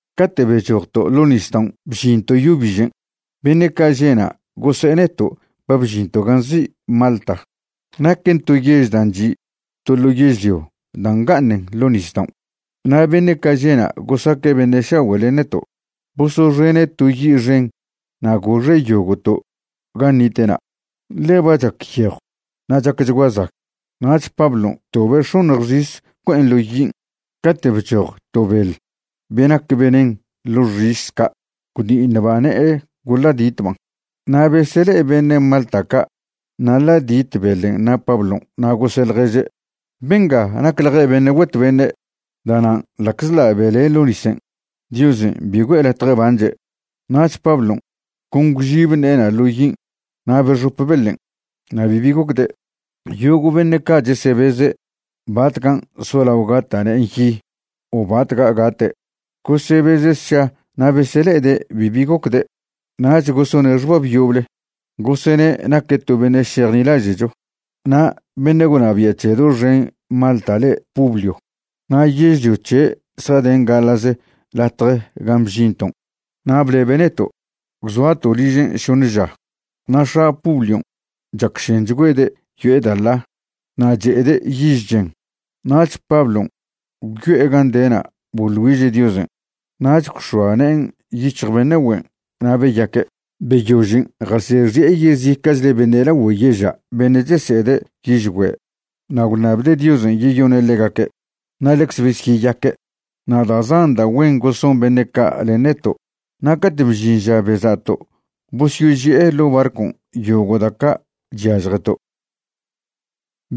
Cate' bechojto' ḻo' nisdaon' bžinto' yo bižen', beṉe' ca' že'na' gose'e neto' ba bžinto' gan' nzi' Malta, naquen to yež dan' chi' to ḻo yežlio da' nga'aṉen ḻo' nisdaon'. Na' beṉe' ca' že'na' gosaque' beṉe' šagüe' len neto', bosoxene' to yi' xen na' goxe' yogo'to' gan' nite'na', ḻe ba chac yejw na' chacchgua zag. Nach Pablon' btobe' x̱oṉj xis bcue'en ḻo yin', cate' bchoj to beḻ be nac venen ḻo xis ca' gwdi'iṉba' ne'e goḻa'ditban'. Na' besele'e beṉe' Malta ca' naḻa'dit beḻen' na' Pablon', na' gose' ḻježe': ―Benga nacḻje' beṉe' güet beṉe'. Da'nan' ḻa'czḻa' bele' ḻo' nisen', Diosen' bi güe'e latje banche'. Nach Pablon' con gwžib ne'ena' ḻo yin' na' bexope beḻen', na' bibi gocde'. Yogo' beṉe' ca' chesebeze' batcan' solao gata' ne'en yi o batca' gate'. Gosebeze' sša na' besele'ede' bibi gocde'. Nach gosone' xbab yoble, gosene' naque' to beṉe' šejnilaže'cho. Na' beṉe' gwnabia' c̱he doxen Malta le' Publio na' yežlio c̱he' zjaden gaḻa'ze latje gan' bžinton', na' blebe' neto', gwzoato' ližen' šoṉe ža. Na' x̱a Publion' chacšenchgüede' yo'e da' ḻa na' che'ede' yiž chen. Nach Pablon' gwyo'e gan' de'na' boḻ güiže' Diosen', nach gwx̱oa ne'en yic̱hj beṉe' güen' na' beyaque'. Beyožen' jasexi'e yezica'chle beṉe' lagüe yeža' beṉe' chese'ede' yižgüe' na' gwnabde' Diosen' yeyone' ḻegaque', na' ḻecze besyeyaque'. Na' da' zan da' güen goson beṉe' ca' len neto'. Na' cate' bžin ža beza'to' bosyoži'e ḻo' barcon' yogo' da' ca' chyažjeto'.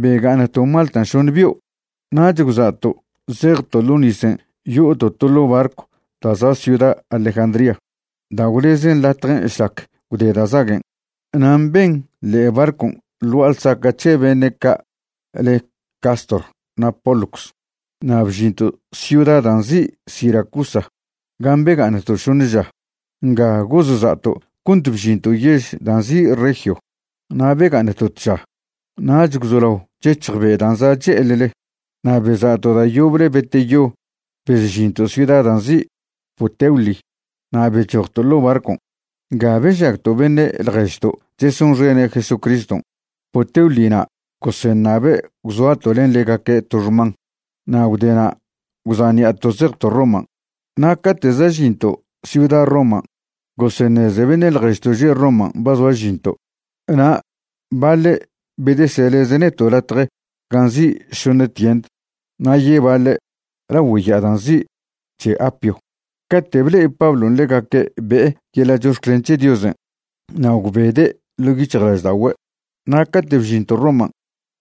Bega'aṉto' Malta šoṉ bio', nach gwza'to' zejto' ḻo nisen' yo'oto' to ḻo' barcw da' za' ciuda Alejandría da' gwlezen latjen' šlac gwde da' zaguen'. Na' mben ḻe'e barcon' ḻ gua'a ḻsaca' c̱he beṉe' ca' le' Cástor na' Pólux. Na' bžinto' ciuda dan' nzi' Siracusa gan' bega'aṉto' šoṉe ža. Nga gozza'to' cont bžinto' yež da' nzi' Regio. Na' bega'aṉto' tža. Nach gwzolao chec̱hj be' dan' za' che'eḻle, na' beza'to' da' yoble beteyo bezžinto' ciuda da' nzi' Puteoli na' bechojto' ḻo' barcon'. Nga bežagto' beṉe' ḻježto' chesonxene' Jesucriston' Puteoli na' goseṉabe' gwzoato' len ḻegaque' to xman. Na' gwdena' gwza' ṉi'ato' zejto' Roman'. Na' cate' za' žinto' ciuda Roman' goseṉeze beṉe' ḻježto' že' Roman' ba zoa žinto', na' baḻe' bedeseleze' neto' latje gan' nzi' Šoṉe Tiend na' yebaḻe' lagüe ya'a dan' nzi' C̱he Apio. Cate' ble'e Pablon' ḻegaque' be'e yeḻa' chox̱clen c̱he Diosen' na' gwbede' ḻo' yic̱hjlažda'ogüe'. Na' cate' bžinto' Roman',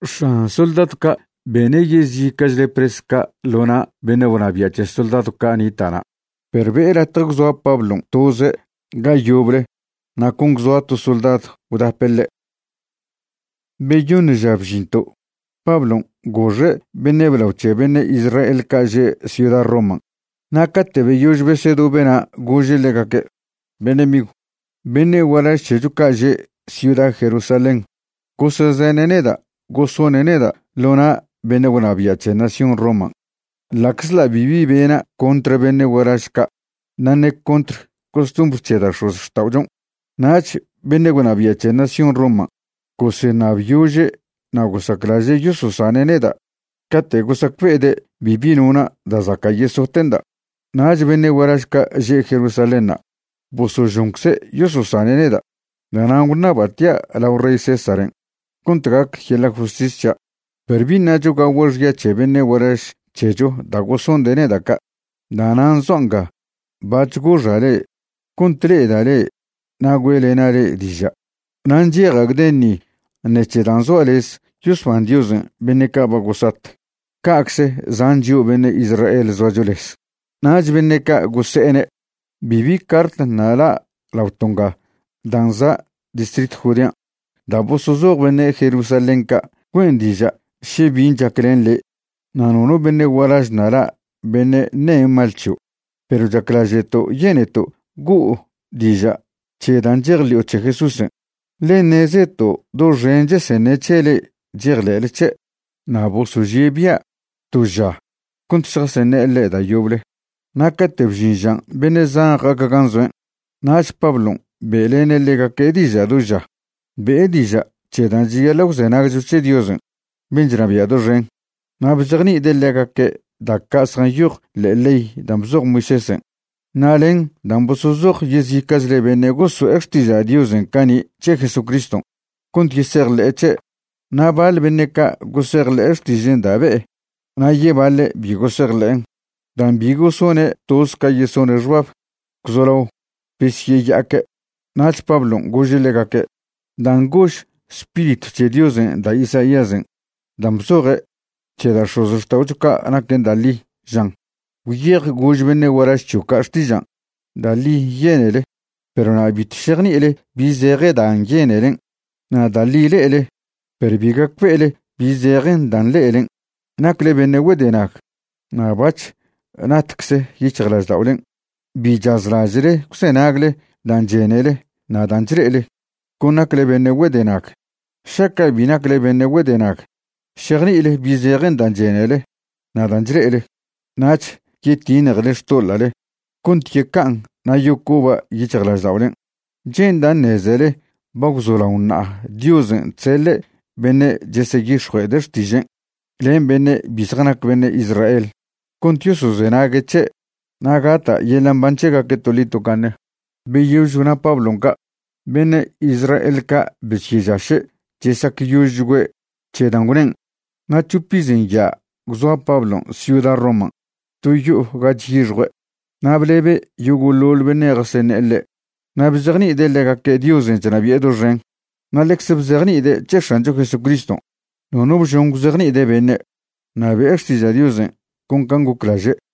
x̱an soldadw ca' bene' yezica'chle pres ca' ḻo na' beṉe' gwnabia' c̱he soldadw ca' nita' na', perw be'e latje gwzoa Pablon' toze' ga yoble na' con gwzoa to soldadw gwdape' ḻe'. Beyoṉ ža bžinto', Pablon' goxe' beṉe' blao c̱he beṉe' Israel ca' že' ciuda Roman'. Na' cate' beyož besedobe'na' gože' ḻegaque': ―Beṉe' migw, beṉe' gualaž c̱hecho ca' že' ciuda Jerusalén gosezene' neda' gosone' neda' ḻo na' beṉe' gwnabia' c̱he nación Roman', ḻa'czḻa' bibi bena' contr beṉe' gualaž ca' na' ṉe contr costumbr c̱he da' x̱ozxta'ochon'. Nach beṉe' gwnabia' c̱he nación Roman' goseṉabyože' na' gosaclaže' yososane' neda' cate' gosacbe'ede' bibi nona' da' zaca' yesote'nda'. Nach beṉe' gualaž ca' že' Jerusalénṉa' bosožoncze' yososane' neda'. Da'nan' gwṉaba' tia' lao rey Césaren' cont gac yeḻa' justis c̱hia'. Perw bi ṉacho gagua' xya c̱he beṉe' gualaž c̱hecho da' gosonde' neda' ca'. Da'nan' zoa' nga bac̱h goxa' le'e cont le'eda' le'e na' güe'lena' le'e diža'. Na' ncheja' gden ni ṉec̱he dan' zoa' lez yosban Diosen' beṉe' ca' ba gosat, cacze zan chio' beṉe' Israel zoacho lez. Nach beṉe' ca' gose'ene': ―Bibi cart ṉa' la' laoto' nga dan' za' distritw Judean' da' bosozoj beṉe' Jerusalén ca' güen' diža' še bin' chac len le', na' nono beṉe' gualaž ṉa' la' beṉe' ṉe mal c̱hio'. Perw chaclaže'to' yeneto' go'o diža' c̱he dan' chejḻi'o c̱he Jesúsen', ḻe ṉezeto' doxen cheseṉe' c̱he le'e chejḻe'le c̱he'. Na' bosožie' bia' to ža cont šjaseṉe'e ḻe' da' yoble, na' cate' bžin žan' beṉe' zan ja'aque' gan' zoen'. Nach Pablon' be'lene' ḻegaque' diža' do ža. Be'e diža' c̱he dan' cheyaḻa' gwzenagcho c̱he Diosen' ben' chnabia' doxen, na' bzejni'ide' ḻegaque' da' ca' zjanyoj ḻe'e ley dan' bzoj Moisésen' na' len dan' bosozoj yezica'chle beṉe' goso'e xtiža' Diosen' cani' c̱he Jesucriston', cont yesejḻe'e c̱he'. Na' baḻ beṉe' ca' gosejḻe'e xtižen' da' be'e na' yebaḻe' bi gosejḻe'en'. Dan' bi gosone' toz ca yesone' xbab, gwzolao besyeya'aque'. Nach Pablon' gože' ḻegaque': ―Dan' gož Spiritw c̱he Diosen' da' Isaíasen' dan' bzoje' c̱he da' x̱ozxta'ocho ca' naquen da' ḻi, žan: Gwyej gož beṉe' gualaž c̱hio' ca' xtižan': Da' ḻi yenele, perw na' bitw šejni'ile bi zeje dan' yenelen'. Na' da' ḻi le'ele, perw bi gacbe'ele bi zejen dan' le'elen'. Nacle beṉe' güedenag na' bac̱h natcze yic̱hjlažda'olen'. Bi chazlaže'le gwzenagle dan' chenele na' dan' chle'ele; con nacle beṉe' güedenag. Šaca' bi nacle beṉe' güedenag, šejni'ile bi zejen dan' chenele na' dan' chle'ele. Nach yetiṉjele xtoḻa'le cont yeca'an na' yocoba' yic̱hjlažda'olen'. Che'nda' ṉezele ba gwzolaon ṉa'a Diosen' chseḻe' beṉe' cheseyix̱jue'ede' xtižen' len beṉe' bi zjanac beṉe' Israel cont yosozenague' c̱he' na' gata' yeḻa' mban c̱hegaque' toḻi tocaṉe. Beyož gwna Pablon' ca', beṉe' Israel ca' besyežaše' chesacyožchgüe' c̱he dan' gwnen'. Na' c̱hop iz nya' gwzoa Pablon' ciuda Roman' to yo'o ga chyixjue', na' blebe' yogo'ḻoḻ beṉe' jaseṉe'e ḻe'. Na' bzejni'ide' ḻegaque' Diosen' chnabi'e doxen, na' ḻecz bzejni'ide' c̱he X̱ancho Jesucriston'. Nono bžon gwzejni'ide' beṉe', na' be'e xtiža' Diosen' con can' goclaže'.